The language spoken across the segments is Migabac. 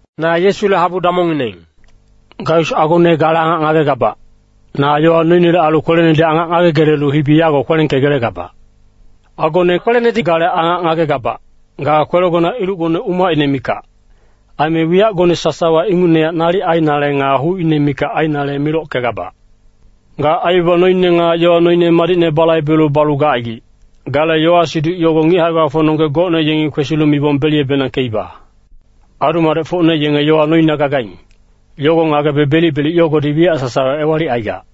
Na Yesule habu damongngineng. Gaius agone gale angac ngagegabac, na yowa noinele ailu kwelenedi angac ngagegelelu hibi yago kwelengkegelegabac. Agone kwelenedi gale angac ngagegabac, ga kwelegona ilucgone umacine mikac. Aime wiyacgone sasawa ingucnehac nalic ainale nga hucine mikac ainale milockegabac. Ga aibaba noine nga yowa noine madicne balaibelu balu gacaigic, gale yowa-siduc yogo ngic hae-gbafocnonggec gocne yengi kwesilu mibong beliyebenangkeiba. Adu-madecfocne yenge yowa noina gagaing, yogo ngagebe belic-belic yogodi wiyac sasawa ewalicaigac.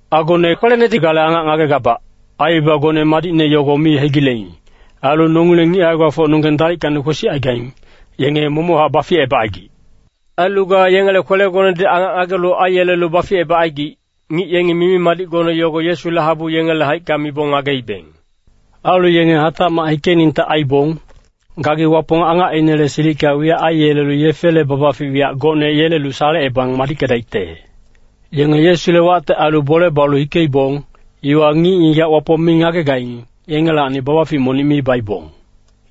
Agone kwelenedi gale angac ngagegabac, aibabagone madicne yogo mi hegileing. Ailu nongileng ngic hae-gbafocnonggeng dalickacni kwesicaigaing, yenge momochac baficebacaigic. Ailu ga yengele kwelegonedi angac ngagelu aiyelelu baficebacaigic, ngic yengi mimi-madicgone yogo Yesule habu yengele haicka mibong ngageibeng. Ailu yenge hatacmac hikeningte aibong, gagi Wapong angacinele silicka wiyac aiyelelu yefele babafic wiyac gocne yelelu salecebang madickedaicte. Yenge Yesule wacte ailu bole balu hikeibong, iwa ngic-ngigac Wapong mi ngagegaing, yengelacni babafic monic mi baibong.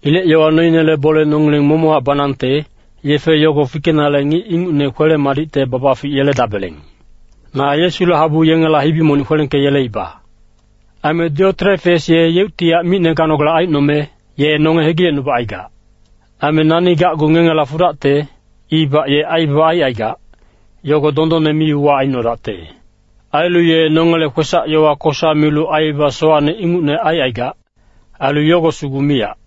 Ilec yowa noinele bole nongileng momochac banangte, yefe yogo fikenale ngic ingucne kwele-madicte babafic yeledabeleng. Na Yesule habu yengela hibi monic kwelengkeyeleiba. Aime Dioterefes ye yeuctihac micne ganogale aicnome, ye nonge hegilecnubacaigac. Aime nani gacgu ngengela fudacte, ibac ye aibaba aicaigac, yogo dondonne mi-uwac aicnodacte. Ailu ye nongele kwesac-yowa kosa milu aibaba sowacne ingucne aicaigac. Ailu yogo sugu miyac,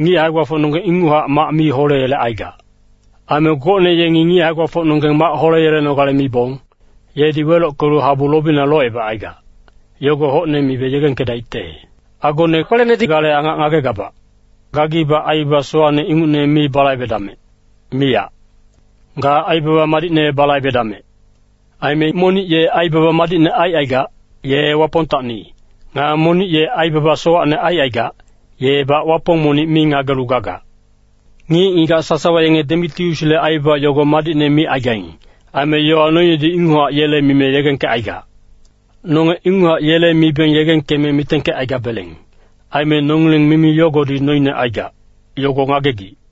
ngic hae-gbafocnonggeng inguchac mac mi holeyelecaigac. Aime gocne yengi ngic hae-gbafocnonggeng mac holeyelenogale mibong, yedi welockelu habu lobina locebacaigac, yogo hocne mibe yegengkedaicte. Agone kwelenedi gale angac ngagegabac, gagibac aibaba sowacne ingucne mi balaibedamec, miyac. Ga aibaba madicne balaibedamec. Aime monic ye aibaba madicne aicaigac, ye Wapongtacni, nga monic ye aibaba sowacne aicaigac, yebac Wapong monic mi ngagelu gagac. Ngic-ngigac sasawa yenge Demitiusle aibaba yogo madicne micaigaing. Aime yowa noinedi inguchac yele mime yegengkecaigac. Nonge inguchac yele mibeng yegengkeme mitengkecaigabeleng. Aime nongileng mimi yogodi noine aigac, yogo ngagegic.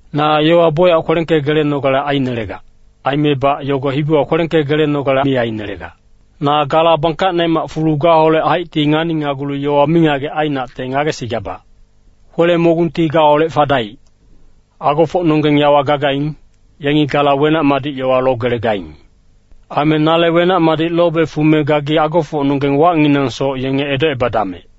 Na yowa bocyac kwelengkegelenogale ainelegac. Aimebac yogo hibiwa kwelengkegelenogale mi ainelegac. Na gala bangkacnemac fulu gaholec haicti nganinagulu yowa mingagec ainacte ngagesigabac. Kwele-mogungti gaholec fadaic. Agofocnonggeng yawa gagaing, yengi gala wenac-madic yowa logelegaing. Aime nale wenac-madic lobe fume gagi agofocnonggeng wacnginangsoc yenge edocebadamec.